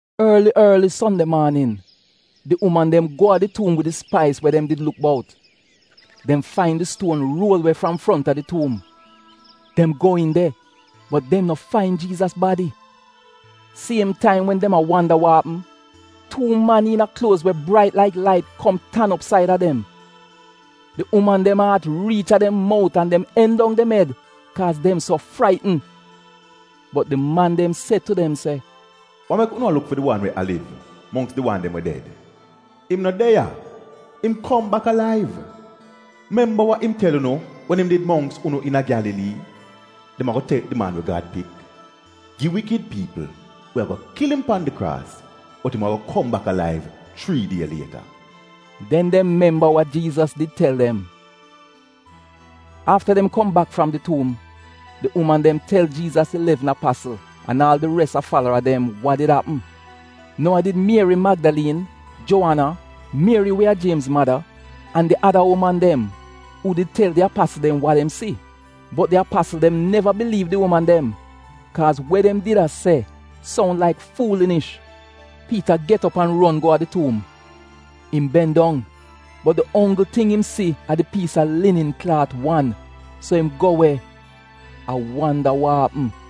Orli, orli Sonde maanin, di uman dem go a di tuum wid di spais we dem did luk bout. Dem fain di stuon ruol we fram fronta di tuum. Dem go iin de, bot dem no fain Jiizas badi. Siem taim wen dem a wanda wa apm, tuu man iina kluoz we brait laik lait kom tan op said a dem. Di uman dem aat riich a dem mout an dem eng dong dem ed kaaz dem so fraitn. Bot di man dem se tu dem se, “Wa mek unu a luk fi di wan we liv mongks di wan dem we ded? Im no de ya, im kom bak alaiv! Memba wa im tel unu wen im did mongks unu iina Gyalalii. ‘Dem ago tek di Man we Gad Pik gi wikid piipl we ago kil im pan di kraas bot im ago kom bak alaiv chrii die lieta.’” Den dem memba we Jiizas did tel dem. Afta dem kom bak fram di tuum, di uman dem tel Jiizas ilevn apasl an aal di res a falara dem wa did apm. Nou a did Mieri Magdaliin, Juowana, Mieri we a Jiemz mada, an di ada uman dem, uu did tel di apasl dem wa dem si. Bot di apasl dem neva biliiv di uman dem, kaaz we dem did a se soun laik fuulinish. Piita get op an ron go a di tuum. Im ben dong, bot di onggl ting im si a di piisa linin klaat wan, so im go we, a wanda wa apm.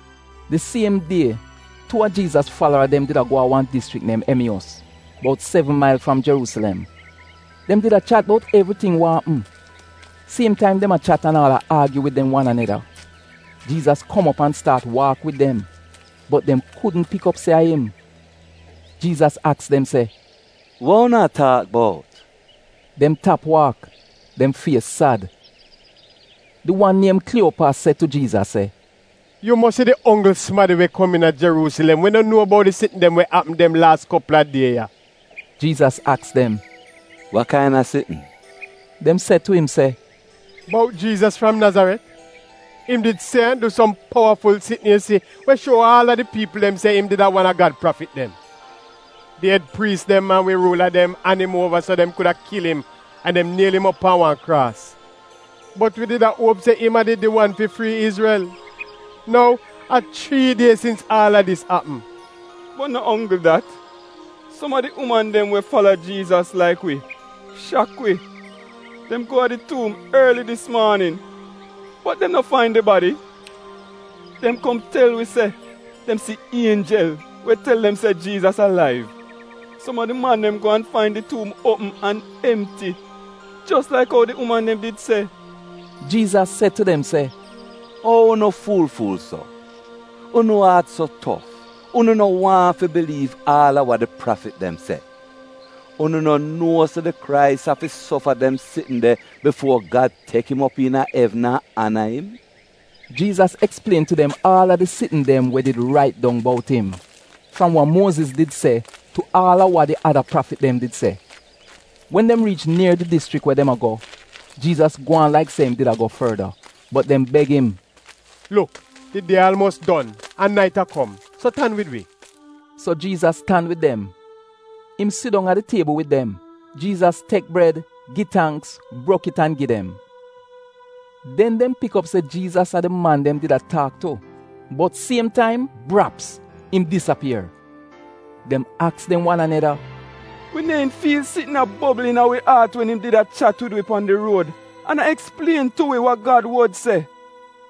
Di siem die tuu a Jiizas falara dem did a go a wan dischrik niem Emiyos, bout sevn mail fram Jeruusilem. Dem did a chat bout evriting wa apm. Siem taim dem a chat an aal a aagyu wid dem wan aneda, Jiizas kom op an staat waak wid dem, bot dem kudn pik op se a im. Jiizas aks dem se, “Wa unu a taak bout?” Dem tap waak, dem fies sad. Di wan niem Kliiyopas, se tu Jiizas se, “Yu mosi di onggl sumadi we kom iina Jeruusilem we no nuo bout di sitn dem wa apm dem laas kopl a die ya.” Jiizas aks dem, “Wa kaina sitn?” Dem se tu im se, “Bout Jiizas fram Nazaret. Im did se an du som powaful sitn yu si we shuo aal di piipl dem se im a wan a Gad prafit dem. Di ed priis dem an wi ruula dem an im uova so dem kuda kil im, an dem niel im op pan wan kraas. Bot wi did a uop se im a did di wan fi frii Izrel. Nou a chrii die sins aal a dis apm. Bot no onggl dat, som a di uman dem we fala Jiizas laik wi, shak wi. Dem go a di tuum orli dis maanin bot dem no fain di badi. Dem kom tel wi se, dem si ienjel we tel dem se Jiizas alaiv. Som a di man dem go an fain di tuum uopm an emti jos laik ou di uman dem did se.” Jiizas se tu dem se, “Ou unu fuul-fuul so, unu aat so tof unu no waahn fi biliiv aal a wa di prafit dem se! Unu no nuo se di Krais afi sofa dem sitn de bifuo Gad tek im op iina evn an ana im?” Jiizas eksplien tu dem aal a di sitn dem we did rait dong bout im, fram wa Muoziz did se tu aal a wa di ada prafit dem did se. Wen dem riich nier di dischrik we dem a go, Jiizas gwaan laik se im did a go forda. Bot dem beg im, “Luk di die aalmuos don, an nait a kom, so tan wid wi.” So Jiizas tan wid dem. Im sidong a di tiebl wid dem. Jiizas tek bred, gi tangks, brok it an gi dem. Den dem pik op se Jiizas a di man dem did a taak tu bot siem taim, braps, im disapier. Dem aks dem wan aneda, “Wi neehn fiil sitn a bobl iina wi aat wen im did a chat wid wi pan di ruod an a eksplien tu wi wa Gad wod se?”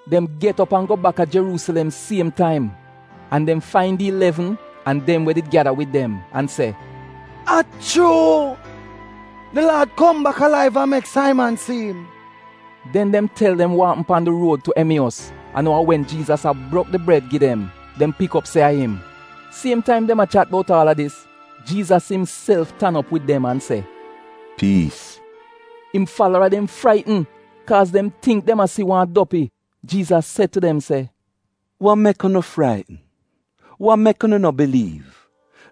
Dem get op an go baka Jeruusilem siem taim. An dem fain di Ilevn an dem we did gyada wid dem an se, “A chuu! Di Laad kom bak alaiv an mek Saiman si'im.” Den dem tel dem wa apm pan di ruod tu Emiyos, an ou a wen Jiizas a brok di bred gi dem, dem pik op se a im. Siem taim dem a chat bout aal a dis, Jiizas imself tan op wid dem an se, “Piis!” Im falara dem fraitn, kaaz dem tingk dem a si wan dopi. Jiizas se tu dem se, “Wa mek unu fraitn? Wa mek unu no biliiv?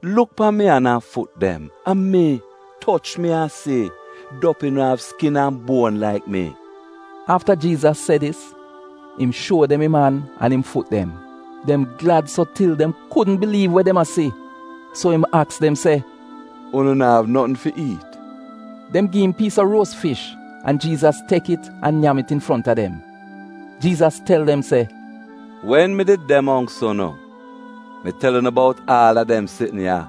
Luk pan mi an an fut dem. A mi! Toch mi an si. Dopi no av skin an buon, laik mi.” Afta Jiizas se dis, im shuo dem im an an im fut dem. Dem glad so til dem kudn biliiv we dem a si. So im aks dem se, “Unu naav notn fi iit?” Dem gi im piis a ruos fish, an Jiizas tek it an nyam it infront a dem. Jiizas tel dem se, “Wen mi did de mongks unu mi tel unu bout aal a dem sitn ya.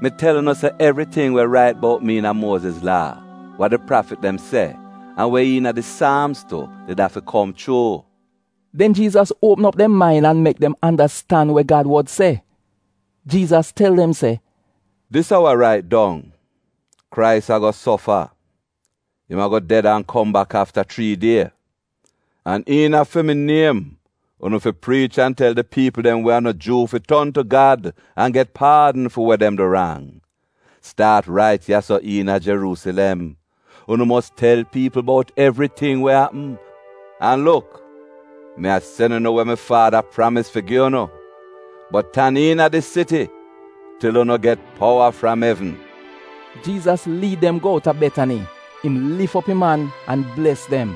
Mi tel unu se evriting we rait bout mi iina Muoziz Laa, wa di prafit dem se an we iina di Saamz tu did afi kom chuu.” Den Jiizas uopm op dem main an mek dem andastan we Gad wod se. Jiizas tel dem se, “Dis a wa rait dong: Krais ago sofa, im ago ded an kom bak afta chrii die, an iina fi mi niem unu fi priich an tel di piipl dem we a no Juu fi ton tu Gad an get paadn fi we dem du rang. Staat rait ya-so iina Jeruusilem. Unu mos tel piipl bout evriting we apm. An luk, mi a sen unu we mi Faada pramis fi gi unu, bot tan iina di siti til unu get powa fram evn.” Jiizas liid dem go out a Betani. Im lif op im an an bles dem.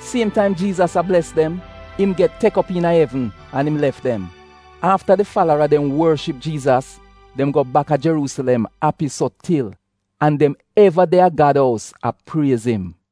Siem taim Jiizas a bles dem, im get tek op iina evn an im lef dem. Afta di falara dem worship Jiizas dem go baka Jeruusilem api so til. An dem eva de a Gad ous a priez im.